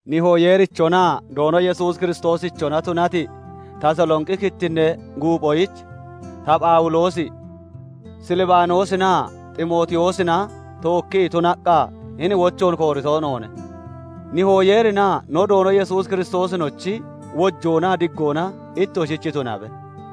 Nihoo Yeerichonaa Doono Yesuus Kiristoosichona tunati, Tasalonqi kittinnee guuphoyich, ta Phawuloosi, Silbaanoosinaa Ximootiyoosina tookkii tunaqqa hini wochoon koorito noone. Nihoo Yeerinaa no Doono Yesuus Kiristoosinochi wojoonaa diggona ittoshich tunabe.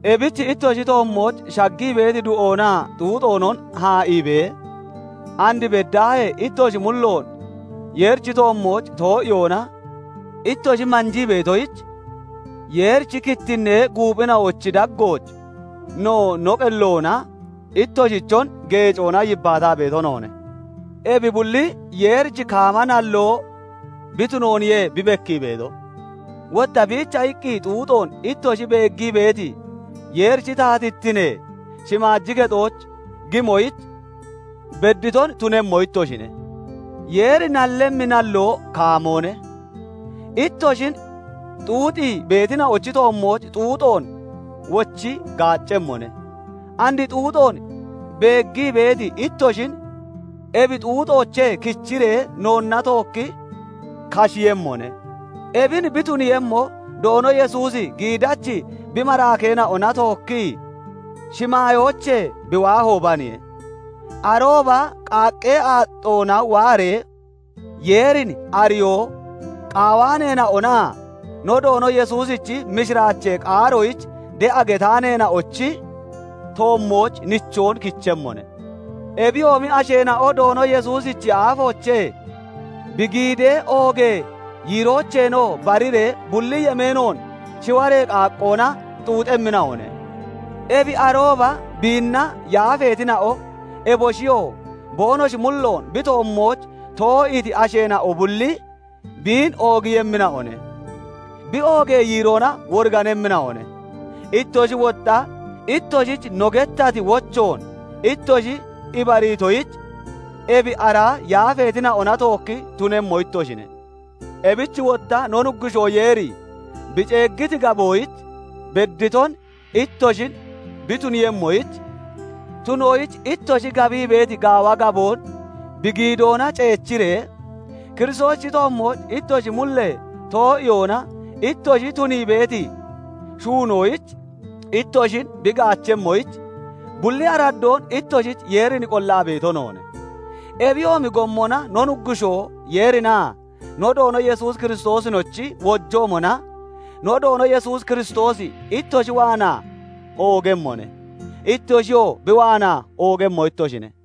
Ebich ittoshi toommooch shaggii beeti du'oonaa xuuxoonon haa'iibee, and beddaahee ittoshi mulloon Yeerichi toommooch too'iyoona ittoshi manjii beetoyich Yeerichi kittinnee guuphina'ochi daggooch no no qelloona ittoshichon geecoona yibbaataa beeto noone. Ebi bulli Yeerichi kaama nalloo bi tunooniye bi bekkii beeto. Wotta biicha iqqi xuuxoon ittoshi beeggii beeti, Yeerichi taatittinee shimaaji kexooch gimoyich bedditon tunemmo ittoshine. Yeeri nallemmi nalloo kaamoone; ittoshin xuuxii beetina'ochi toommooch xuuxoon wochi gaaccemmone; and xuuxoon beeggii beeti ittoshin ebi xuuxoochee kichiree noonna tookki kashiiyemmone; ebin bi tuniiyemmo, Doono Yesuusi giidachi bi maraakeena'ona tookkii shimaayoochee bi waahoobaniye. Arooba qaaqqee aaxxoona waaree, Yeerin ariyoo qaawaaneena'onaa no Doono Yesuusichi mishiraachee qaaroyich de'a getaaneena'onochi toommooch nichoon kichemmone. Ebiyoomi asheena'o Doono Yesuusichi aafoochee, bi giidee oogee yiiroocheenoo bariree bulli yemeenoon shiwaree qaaqqoona xuuxemmina'one. Ebi arooba biinna yaafeetina'o, eboshiyoo boonoshi mulloon bi toommooch too'iiti asheena'o bulli, biin oogiiyemmina'one; bi oogee yiiroona woriganemmina'one. Ittoshi wotta ittoshich no gettati wochoon ittoshi ibariitoyich, ebi ara yaafeetina'ona tookki tunemmo ittoshine. Ebich wotta no Nuggushoo Yeeri bi ceeggiti gaboyich bedditon ittoshin bi tuniiyemmoyich, tuniyoyich ittoshi gabii beeti gaawa gaboon bi giidoona ceechiree, Kiristoosichi toommooch ittoshi mullee too'iyoona ittoshi tunii beeti shuunoyich ittoshin bi gaachemmoyich, bulli araddoon ittoshich Yeerin qollaa beeto noone. Ebiyoomi gommona no Nuggushoo Yeerinaa no Doono Yesuus Kiristoosinochi wojoomona no Doono Yesuus Kiristoosi ittoshi waanaa oogemmone; ittoshiyoo bi waanaa oogemmo ittoshine.